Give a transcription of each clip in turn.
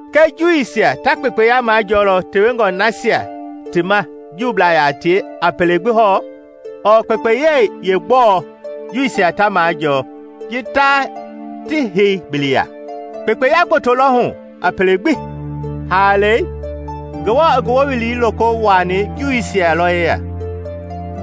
Kɛ Juuisia ta kpekpeya majɔɔlɔ tewengɔ nasia ti ma Juublaa yaa tie a pele gbi hɔɔ? Ɔɔ kpekpeyei yeegbɔɔ Juuisia ta maajɔɔ ji ta ti hei bili ya? Kpekpeya gboto lɔ hu a pele gbi! Haalei, Ngewɔ i ngi wowili loko wuaani Juuisia lɔ yeya.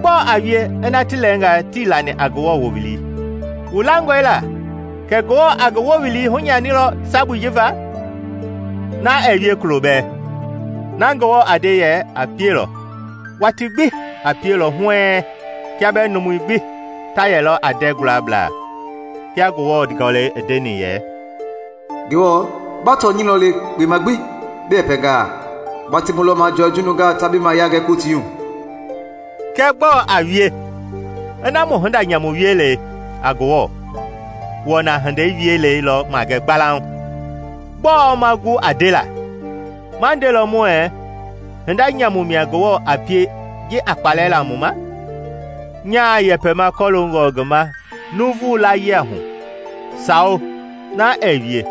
Gbɔɔ a wie ina ti lɛɛnga tii lani a Ngewɔ wowili? Wu langɔe la kɛ Ngewɔ a ngi wowili hunyanilɔ sabui ji va? Na ɛɛ wie kulo bɛɛ! Na Ngewɔ a nde yɛ a pielɔ, watii gbi a pielɔ huɛɛŋ kiaa bɛɛ numui gbi ta yɛlɔ a ndɛ gualablaa. Kia Ngewɔ Gɔlɛi i ndeni yɛ, “Ngewɔ, ba tɔnyɛi lɔ le kpema gbi bi yɛpɛngaa; ba temu lɔ majɔɔ ji nungaa ta bi mayia gɛ kotiihu.” Kɛɛ gbɔɔ a wie ina mu hinda nyamu wielei a Ngewɔ wɔna hinda wielei lɔ magɛ gbalauŋ? Gbɔɔ ma gu a ndela? Ma ndelɔ muɛɛ hinda nyamu mia Ngewɔ a pie ji a kpalɛ la mu ma? (Nyaa yɛpɛma kɔloongɔ ngi ma nuuvu layia hu.) Sawo, na ɛɛ wie!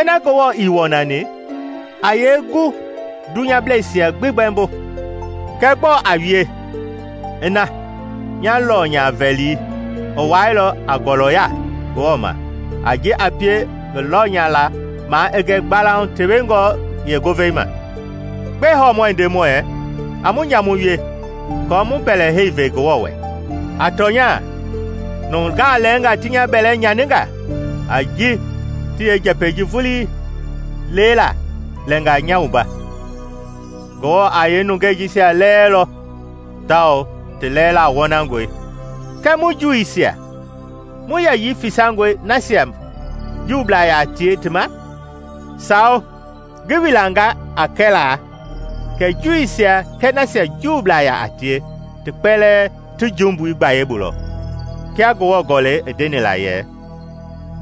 Ina Ngewɔ ii wɔnani, a yee gu i dunyableisia gbi gbɛmbo? Kɛɛ gbɔɔ a wie ina nya lɔnya-vɛlii i wailɔ a ngɔlɔya Ngewɔ ma a ji a pie ngi lɔnyala maa i gɛ gbalauŋ tewengɔ yeengovei ma? Gbɛe hɔɔ muɛ nde muɛɛ, “A mu nyamu wie aako mu mbɛlɛhei ve Ngewɔ wɛ?” A tɔnya nungaa lɛɛnga ti nya bɛlɛ nyaninga a ji ti yeenjɛpɛi ji vulii lelaa lɛnga nya wumba! Ngewɔ a yeenungei nasia lɛɛlɔ tawao ti lɛɛla wɔnangɔe. Kɛ mu Juuisia mu yɛyii fisangɔe nasia Juublaa yaa tie ti ma? Sawo! Ngi wilanga a kɛlaa kɛ Juuisia kɛɛ nasia Juublaa yaa tie ti kpɛlɛɛ ti jumbui gbayei bu lɔ. Kia Ngewɔ Gɔlɛi i ndeni la yɛ;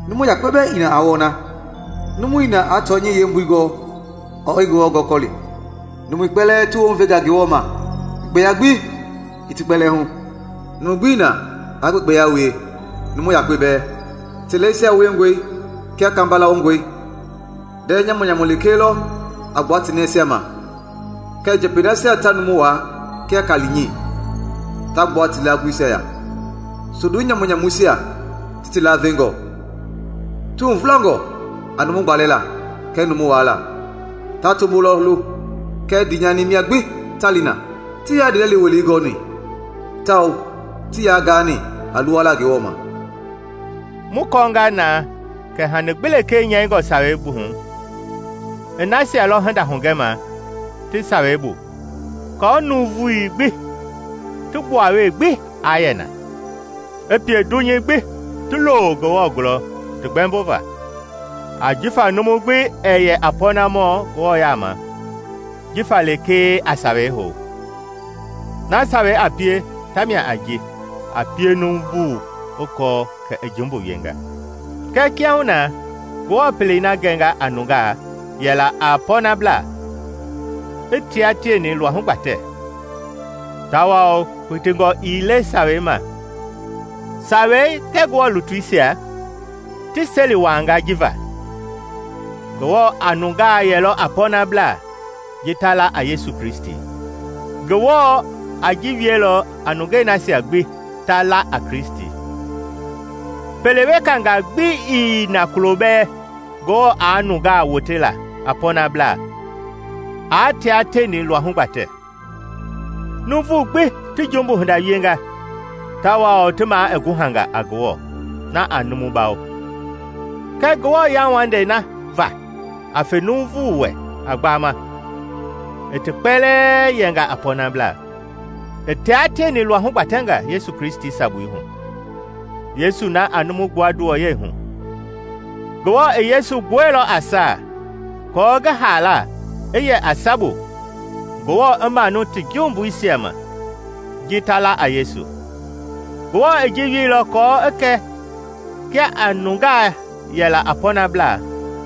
“Numu yakpe bɛɛ ii na aa wɔna, numu ii na aa tɔnyɛi yeembui gɔɔ ɔɔ i Ngewɔ gɔkɔli. Numui kpɛlɛɛ ti wounvenga Ngewɔ ma, kpekpeya gbi ii ti kpɛlɛɛ hu: numu gbii na aa kpekpeya wie, numu yakpe bɛɛ. Ti lɛisia wiengɔe kia kamba lawongɔi; ndɛɛ nyamu-nyamu lekee lɔ a gilikili ti nɛisia ma, kɛɛ njɛpɛi nasia ta numu waa, kia kaali-nyi, ta gbua ti laagulisia ya; sondu nyamu-nyamuisia ti ti lavengɔ. Ti huvulangɔ a numu gbalɛla kɛɛ numu waala; ta tombo lɔ lo kɛɛ ndiinyani mia gbi ta li na. Tii yaa ndiilɛli welei gɔɔni; tawao tii yaa gaani a luwala Ngewɔ ma.” Mu kɔɔnga na kɛ hani gbi lekee nyɛingɔ Sawei hu i nasia lɔ hinda hugɛma ti Sawei bu aako nuuvui gbi ti gbuawee gbi aa yɛ na, i pie dunyei gbi ti lo Ngewɔ gulɔ ti gbɛmbova. Ajifa numu gbi ɛɛ yɛ a pɔnamɔ Ngewɔ yaama jifa lekee a Sawei hou; na Sawei a pie ta mia a ji a pie nuuvu i kɔɔ kɛ i jumbu wienga. Kɛɛ kiahuna Ngewɔ pelei na gɛnga a nungaa yɛ la a pɔɔnablaa i tia tieni luahu gbatɛ, tawao kpitingɔ ii le Sawei ma. Sawei kɛɛ Ngewɔ lutuisia ti seli wuaanga ji va. Ngewɔ a nungaa yɛlɔ a pɔɔnablaa ji ta la a Yesu Kristi. Ngewɔ a ji wielɔ a nungei nasia gbi ta la a Kristi. Pele wekangaa gbi ii na kulo bɛɛ Ngewɔ aa nungaa wote la a pɔɔnablaa aa tia tieni luahu gbatɛ. Nuuvu gbi ti jumbu hinda wienga tawao ti maa i guhanga a Ngewɔ na a numu bawo. Kɛɛ Ngewɔ yauwandei na va a fe numu wɛ a gbaama, i ti kpɛlɛɛ yɛnga a pɔɔnablaa, i taa tieni luahu gbatɛnga Yesu Kristi sabui hu, Yesu na a numu gbua nduwɔyɛi hu. Ngewɔ i Yesu gbuɛilɔ a saa aako ngi haala i yɛ a sabu Ngewɔ i manu ti jumbuisia ma, ji ta la a Yesu. Ngewɔ i ji wieilɔ aako i kɛ kia a nungaa yɛ la a pɔɔnablaa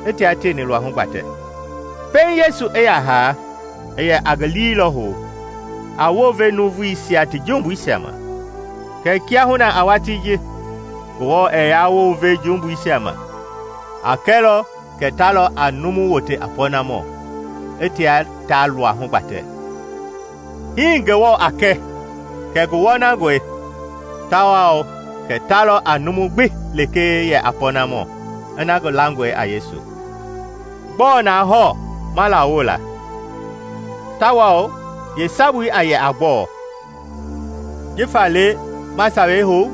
i tia tieni luahu gbatɛ. Pɛiŋ Yesu i ya haa, i yɛ a ngi lii lɔ hou, a wounve nuuvuisia ti jumbuisia ma. Kɛɛ kiahuna a watii ji, Ngewɔ ɛɛ yaa wounve jumbui ma, a kɛlɔ kɛ ta lɔ a numu wote a pɔɔnamɔ i tia ta luahu gbatɛ. Hii Ngewɔ a kɛ kɛ ngi wɔnangɔe tawao kɛ ta lɔ a numu gbi lekee yɛ a pɔnamɔ ina ngi langɔe a Yesu. Gbɔɔ na hɔɔ ma lawo la? Tawao yeesabui a yɛ a gbɔɔ? Jifa le ma Sawei hou?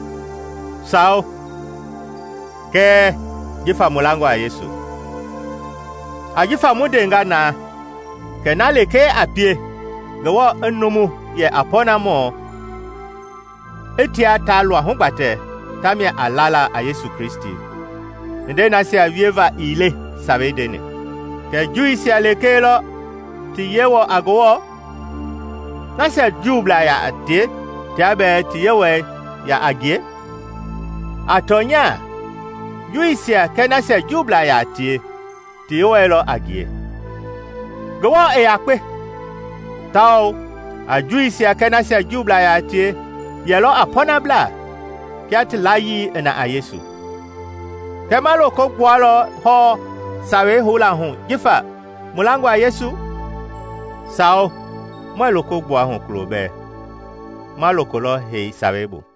Sawo, kɛɛ jifa mu langɔ a Yesu. Ajifa mu ndenga na kɛ na lekee a pie Ngewɔ i numu yɛ a pɔɔnamɔ i tia ta luahu gbatɛ ta mia a lala a Yesu Kristi, hindei nasia wieva ii le Sawei ndeni. Kɛ Juuisia lekee lɔ ti Yewɔ a Ngewɔ? Nasia Juublaa yaa tie tia bɛɛ ti Yewɔɛi yaa a ngie? A tɔnya Juuisia kɛɛ nasia Juublaa yaa tie ti Yewɔɛi lɔ a ngie. Ngewɔ i yakpe, tawao a Juuisia kɛɛ nasia Juublaa yaa tie yɛlɔ a pɔɔnablaa kia ti layii i na a Yesu. Kɛ ma loko gbualɔ hɔɔ Sawei houla hu jifa mu langɔ a Yesu? Sawo muɛɛ loko gbua hu kulo bɛɛ; ma loko lɔ hei Sawei bu.